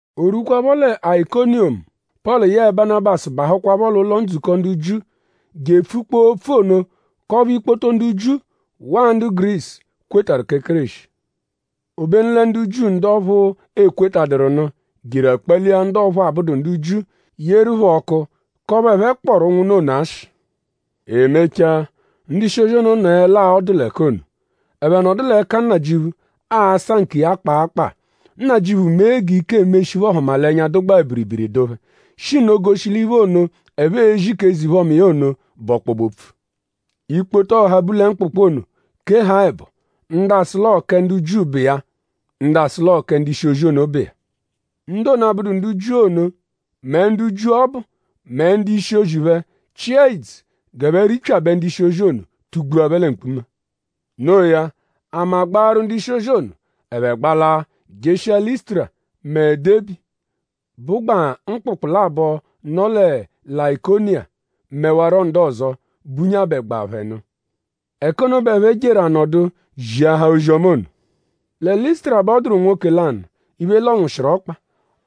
O rwukwaaphọ lẹ Ayikoniyomu; Pọlu yẹe Banabasu bahụkwapho l'ụlo-ndzukọ ndu Jiu je epfukpọo opfu ono k'ọphu ikpoto ndu Jiu waa ndu Gurisu kwetarụ kẹ Kéreshi. Obenu lẹ ndu Jiu ndu ọphu, ekwetaduru nụ jeru akpalia ndu ọphu abụdu ndu Jiu; yeru phẹ ọku k'ọphu ẹphe kpọru ụnwunna ono ashị. E mechaa; ndu-ishi-ozi ono nọelaa ọdu l'ẹka ono. Ẹphe nọdu l'ẹka Nnajịuphu asa nkiya kpaa kpaa. Nnajịuphu mee g'ike emeshi iphe-ọhumalenya, dụgbaa biribiri dụ phẹ; shi nno goshi l'iphe ono, ẹphe ezi k'eze-iphe-ọma iya ono bụ ọkpobe-opfu. Ikpoto ọha, bu lẹ mkpụkpu ono keha ẹbo. Ndu asụ l'ọo kẹ ndu Jiu bụ iya; ndu asụ l'ọo kẹ ndu-ishi-ozi ono bụ iya. Ndu ono, abụdu ndu Jiu ono mẹ ndu Jiu ọbu mẹ ndu-ishi phẹ chịa ìdzù g'ẹphe ripyabẹ ndu-ishi-ozi ono tugbua phẹ lẹ mkpuma. No iya; ama gbaaru ndu-ishi-ozi ono; ẹphe gbalaa jeshia Lịsutura mẹ Debi, bụgbaa mkpụkpu labọ, nọ lẹ Layikoniya; mẹwaro ndu ọzo, bunyabẹgbaa phẹ nụ. Ẹka ono bẹ ẹphe jeru anọdu ziahaa ozi-ọma ono. Lẹ Lịsutura bẹ ọ dụru nwoke lanụ, iphe lọnwushiru ọkpa.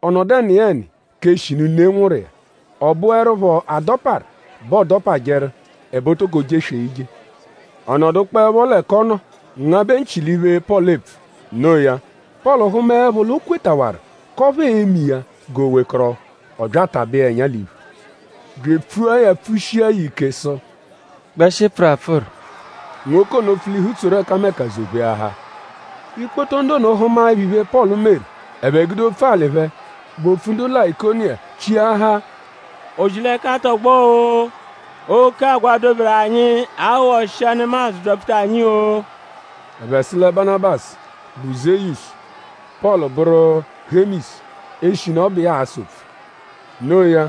Ọ nọdu ẹniyeni k'eshinu ne nwụru iya. Ọ bụerupho adọparu bẹ ọodopajeru; ẹbe o toko jeswee ije. Ọ nọdukpoepho l'ẹka ọ nọ ngabẹ nchị l'iphe, Pọlu epfu. No iya; Pọlu hụmaepho l'o kwetawaru k'ọphu ee-me iya g'o wekọrohu; ọ bya atabẹ iya ẹnya l'iphu; bya epfua ya pfushia ya ike sụ: “Gbẹshi pfụru apfụru!” Nwoke ono pfulihu tsoru ẹkameka zọ-pheahaa. Ikpoto ndu ono hụmaepho iphe, Pọlu meru; ẹphe gude opfu-alị phẹ, bụ opfu ndu Layikoniya chiahaa: O-ji-l'ẹka tọgbo-o! “Oke agwa, doberu anyi aghọshia nemadzụ byapfuta anyi-o!” Ẹphe sụ lẹ Banabasu bụ Zeyusu; Pọlu bụru Hemisu; eshinu ọ bụ iya aasa opfu. Noo ya;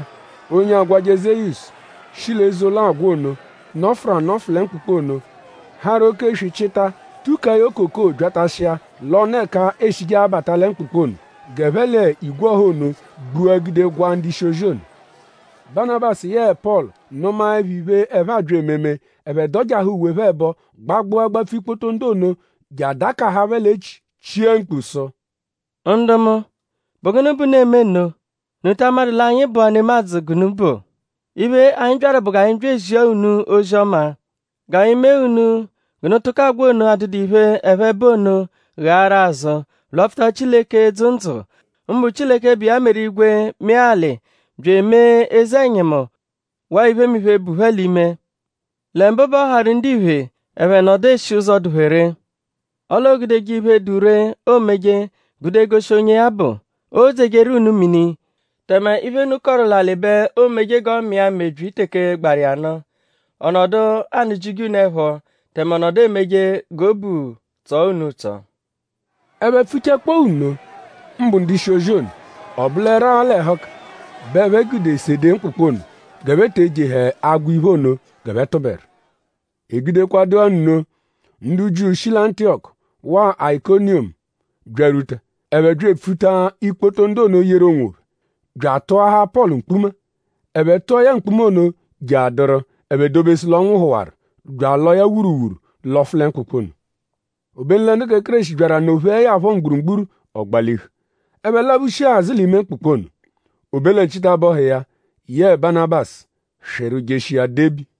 onye agwajẹ Zeyusu shi l'eze-ụlo agwa ono, nọfuru anọfu lẹ mkpụkpu ono harụ oke-eswi chịta tukaa ya okoko byatashia l'ọnu ẹka e shije abata lẹ mkpụkpu ono g'ẹphe l'igwe ọha ono gbua gude gwaa ndu-ishi-ozi ono. Banabasu yẹe Pọlu nụmaepho iphe, ẹphe abya ememe; ẹphe dọjaha uwe phẹ ẹbo gbagbụa gbapfu ikpoto ndu ono je adakaha phẹ l'echi chia mkpu sụ: “Ndu mu;?bụ gụnu bẹ unu eme nno??Unu ta amadụ l'anyi bụa nemadzụ g'unu bụ? Iphe, anyi byaru bụ g'anyi zia unu ozi-ọma; g'anyi mee unu g'unu tụko agwa ono, adụdu iphe, ẹphe bụ ono ghaaru azụ; lwapfuta Chileke, dzụ ndzụ; mbụ Chileke, bụ iya meru igwe mee alị bya emee eze-ẹnyimu waa iphemiphe, bu phẹ l'ime. Lẹ mbụ bẹ ọ harụ ndiphe ẹphe nọdu eshi ụzo, dụ phẹ ree. Ọle oogudeje iphe, dụ ree, oomeje gude goshi onye ya bụ. Oodzejeru unu mini; tẹme iphe, unu kọru l'alị bẹ oomeje g'ọ mịa mebyi teke gbaru iya nụ. Ọ nọdu anụ-jije unu ẹpho; tẹme ọ nọdu emeje g'obu tsọo unu ụtso.” Ẹphe pfuchakpọo nno; mbụ ndu-ishi-ozi ono; ọ bụleru-a l'ẹhuka bẹ ẹphe gude sede mkpụkpu ono g'ẹphe te ejehẹ agwa iphe ono g'ẹphe tụberu. E gudekwadụ-a nno; ndu Jiu, shi lẹ Antiyọku waa Ayikoniyomu byarwuta. Ẹphe bya epfuta ikpoto ndu ono yeru onwophẹ; bya atụahaa Pọlu mkpuma. Ẹphe tụa ya mkpuma ono jeadụru ẹphe dobesu l'ọ nwụhuwaru bya alọo ya wuruwuru lọfu lẹ mkpụkpu ono. Obenu lẹ ndu kẹ Kéreshi byaru anọ-pheẹ ya phọ mgburugburu; ọ gbalihu. Ẹphe laphushia azụ l'ime mkpụkpu ono. O be lẹ nchitabọhu iya yẹe Banabasu swịru jeshia Debi.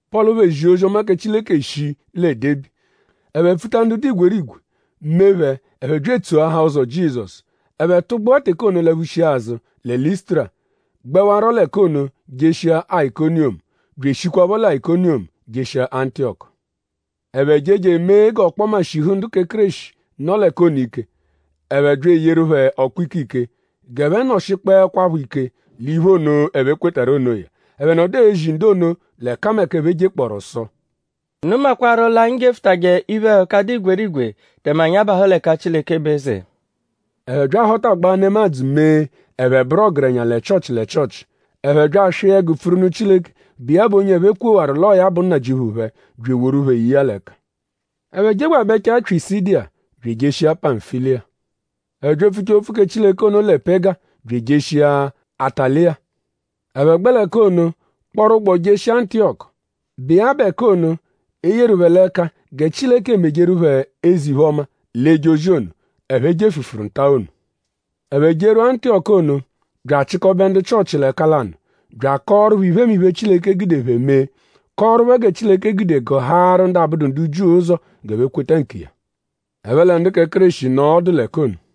Pọlu phẹ zia ozi-ọma kẹ Chileke shii lẹ Debi. Ẹphe pfuta ndu dụ igwerigwe; mee phẹ ẹphe bya etsoahaa ụzo Jizọsu. Ẹphe tụgbua teke ono laphushia azụ lẹ Lịsutura; gbẹwaro l'ẹka ono jeshia Ayikoniyomu; bya eshikwaphọ lẹ Ayikoniyomu jeshia Antiyọku. Ẹphe je je emee g'ọkpoma shihu ndu kẹ Kéreshi, nọ l'ẹka ono ike. Ẹphe bya eyeru phẹ ọkpu-ikike g'ẹphe nọshikpoekwapho ike l'iphe ono, ẹphe kwetarụ onoya. Ẹphe nọdu ezi ndu ono l'ẹkameka, ẹphe jekpọoru sụ: “Unu makwarụ l'anyi jefụtaje iphe-ẹhuka, dụ igwerigwe; tẹme anyi abahụ l'ẹka Chileke bụ eze.” Ẹphe bya ahọtagbaa nemadzụ mee ẹphe bụru ọgerenya lẹ Chịochi lẹ Chịochi. Ẹphe bya aswịa ẹgu pfuru nụ Chileke, bụ iya bụ onye ẹphe kwewaru l'ọo ya bụ Nnajịuphu phẹ; bya eworu phẹ ye iya l'ẹka. Ẹphe jegbabẹchaa Pyisidiya bya ejeshia Pamfiliya. Ẹphe bya epfuchaa opfu kẹ Chileke ono lẹ Pega bya ejeshia Ataliya. Ẹphe gbẹ l'ẹka ono kpọru ụgbo jeshia Antiyọku, bụ iya bụ ẹka ono, e yeru phẹ l'ẹka gẹ Chileke mejeru phẹ eze-iphe-ọma l'eje ozi ono, ẹphe jefụfuru nta ono. Ẹphe jerwua Antiyọku ono bya achịkobe ndu Chịochi l'ẹka lanụ bya akọoru phẹ iphemiphe, Chileke gude phẹ mee; kọoru phẹ gẹ Chileke gude gụhaaru ndu abụdu ndu Jiu ụzo g'ẹphe kweta nkiya. Ẹphe lẹ ndu kẹ Kéreshi nọo ọdu l'ẹka ono.